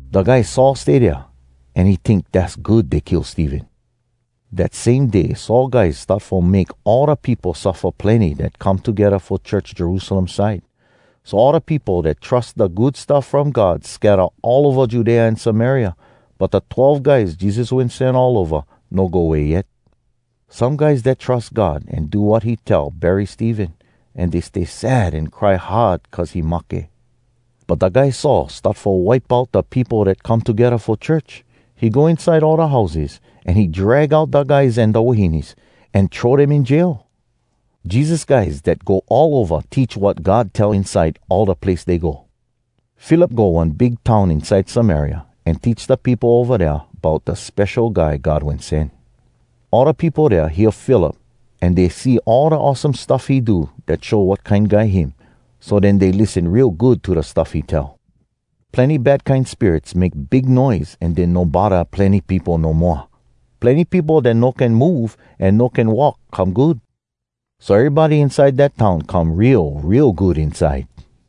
Da guy Saul stay dea, an he tink dass good dey kill Stephen. Dat same day Saul guys start fo make all da peopo suffa plenny dat come togedda fo church Jerusalem side. So all da peopo dat trus da Good Stuff From God scatta all ova Judea an Samaria. But da twelve guys Jesus wen sen all ova no go way yet. Some guys dat trus God an do wat he tell bury Stephen, an dey stay sad an cry hard cuz he mahke. But da guy Saul start fo wipe out da peopo dat come togedda fo church. He go inside all da houses, an he drag out da guys an da wahines, an throw dem in jail. Jesus guys dat go all ova teach wat God tell inside all da place dey go. Philip go one big town inside Samaria, an teach da peopo ova dea bout da Spesho Guy God Wen Sen. All da peopo dea hear Philip, an dey see all da awesome stuff he do dat show wat kine guy him, so den dey lissen real good to da stuff he tell. Plenny bad kine spirits make big noise an den no bodda plenny peopo no moa. Plenny peopo dat no can move an no can walk come good. So erybody inside dat town come real, real good inside.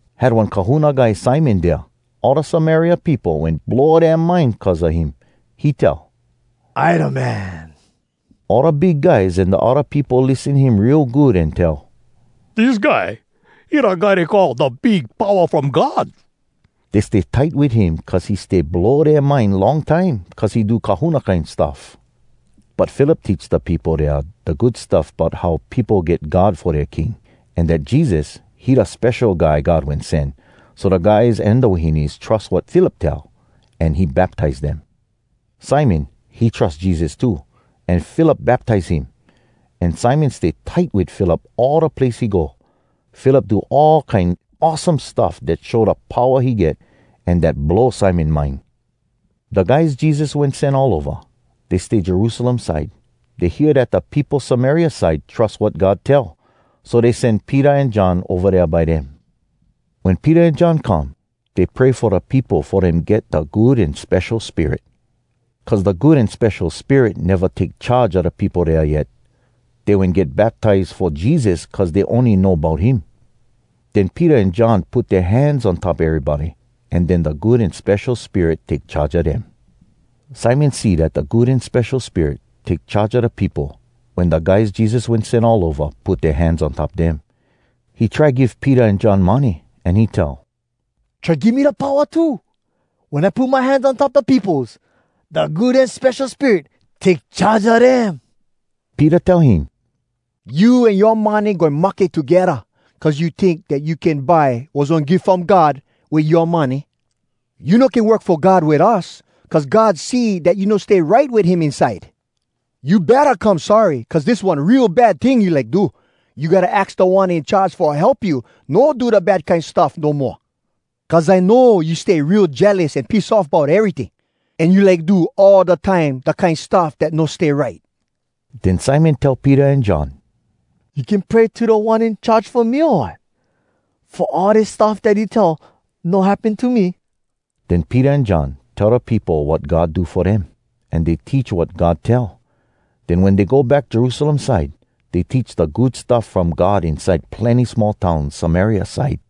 Had one kahuna guy Simon dea. All da Samaria peopo, wen blow dea mind cuz a him. He tell “I da Man!” All da big guys an da odda peopo lissen him real good an tell, “Dis guy, he da guy dey call ‘Da Big Powa From God.’” Dey stay tight wit him cuz he stay blow dea mind long time, cuz he do kahuna kine stuff. But Philip teach da peopo dea da Good Stuff bout how peopo get God fo dea king, an dat Jesus, he da Spesho Guy God Wen Sen. So da guys an da wahines trus wat Philip tell, an he baptize dem. Simon, he trus Jesus too, an Philip baptize him. An Simon stay tight wit Philip all da place he go. Philip do all kine awesome stuff dat show da powa he get, an dat blow Simon mind. Da guys Jesus wen sen all ova, dey stay Jerusalem side. Dey hear dat da peopo Samaria side trus wat God tell. So dey sen Peter an John ova dea by dem. Wen Peter an John come, dey pray fo da peopo fo dem get da Good An Spesho Spirit. Cuz da Good An Spesho Spirit neva take charge a da peopo dea yet. Dey wen get baptize fo Jesus cuz dey ony know bout him. Den Peter an John put dea hands on top erybody, an den da Good An Spesho Spirit take charge a dem. Simon see dat da Good An Spesho Spirit take charge a da peopo wen da guys Jesus wen sen all ova put dea hands on top dem. He try give Peter an John money, an he tell, “Try give me da powa too, wen I put my hands on top da peopos, da Good An Spesho Spirit take charge a dem.” Peter tell him, “You an yoa money goin mahke togedda! Cuz you tink dat you can buy wass one gif from God wit yoa money! You no can work fo God wit us cuz God see dat you no stay right wit him inside. You betta come sorry cuz dis one real bad ting you like do. You gotta aks Da One In Charge fo help you no do da bad kine stuff no moa! Cuz I know you stay real jealous an piss off bout eryting, an you like do all da time da kine stuff dat no stay right.” Den Simon tell Peter an John, “You can pray to Da One In Charge fo me, o wat? Fo all dis stuff dat you tell no happen to me?” Den Peter an John tell da peopo wat God do fo dem, an dey teach wat God tell. Den wen dey go back Jerusalem side, dey teach da Good Stuff From God inside plenny small towns Samaria side.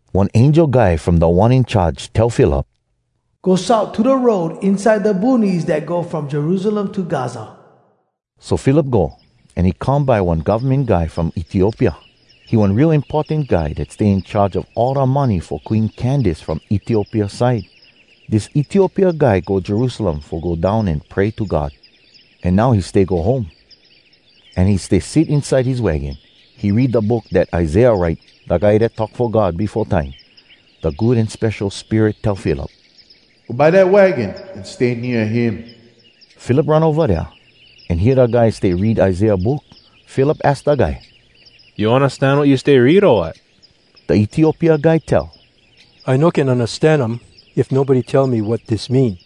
One angel guy from Da One In Charge tell Philip, “Go south to da road inside da boonies dat go from Jerusalem to Gaza.” So Philip go, an he come by one govmen guy from Etiopia. He one real importan guy dat stay in charge a all da money fo Queen Candace from Etiopia side. Dis Etiopia guy go Jerusalem fo go down an pray to God. An now he stay go home, an he stay sit inside his wagon. He read da book dat Isaiah write, da guy dat talk fo God befo time. Da Good An Spesho Spirit tell Philip, “Go by dat wagon an stay nea him.” Philip run ova dea, an hear da guy stay read Isaiah book. Philip aks da guy, “You undastan wat you stay read, o wat?” Da Etiopia guy tell, “I no can undastan um if nobody tell me wat dis mean.”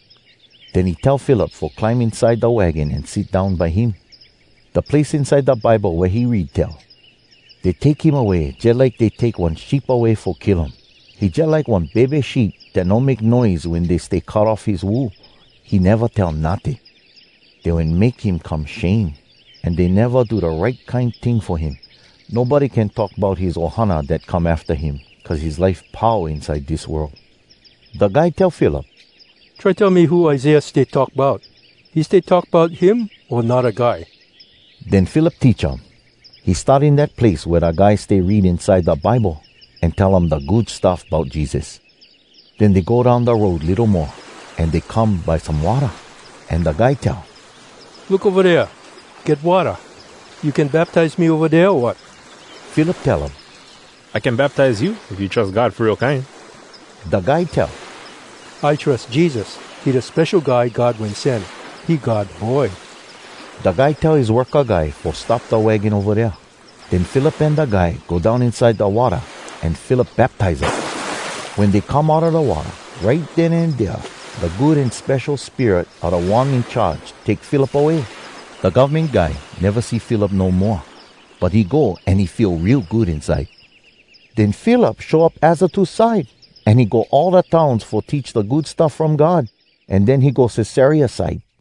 Den he tell Philip fo climb inside da wagon an sit down by him. Da place inside da Bible wea he read tell, “Dey take him away Jalike dey take one sheep away fo kill um. He jalike one bebe sheep Dat no make noise Wen dey stay cut off his wool. He neva tell notting. Dey wen make him come shame, An dey neva do da right kine ting fo him. Nobody can talk bout his ohana dat come afta him, Cuz his life pau Inside dis world.” Da guy tell Philip, “Try tell me who Isaiah stay talk bout. He stay talk bout him o anodda guy?” Den Philip teach um. He start in dat place wea da guy stay read inside da Bible, an tell um da Good Stuff Bout Jesus. Den dey go down da road litto mo, an dey come by some watta. An da guy tell, “Look ova dea! Get watta. You can baptize me ova dea, o wat?” [Philip tell um, “I can baptize you if you trus God fo real kine.” Da guy tell, “I trus Jesus, he da Spesho Guy God Wen Sen. He God Boy.”] Da guy tell his worka guy fo stop da wagon ova dea. Den Philip an da guy go down inside da watta an Philip baptize um. Wen dey come outa da watta, right den an dea da Good An Spesho Spirit a Da One In Charge take Philip away. Da govmen guy neva see Philip no moa, but he go an he feel real good inside. Den Philip show up Azotus side, an he go all da towns fo teach da Good Stuff From God. An den he go Cesarea side.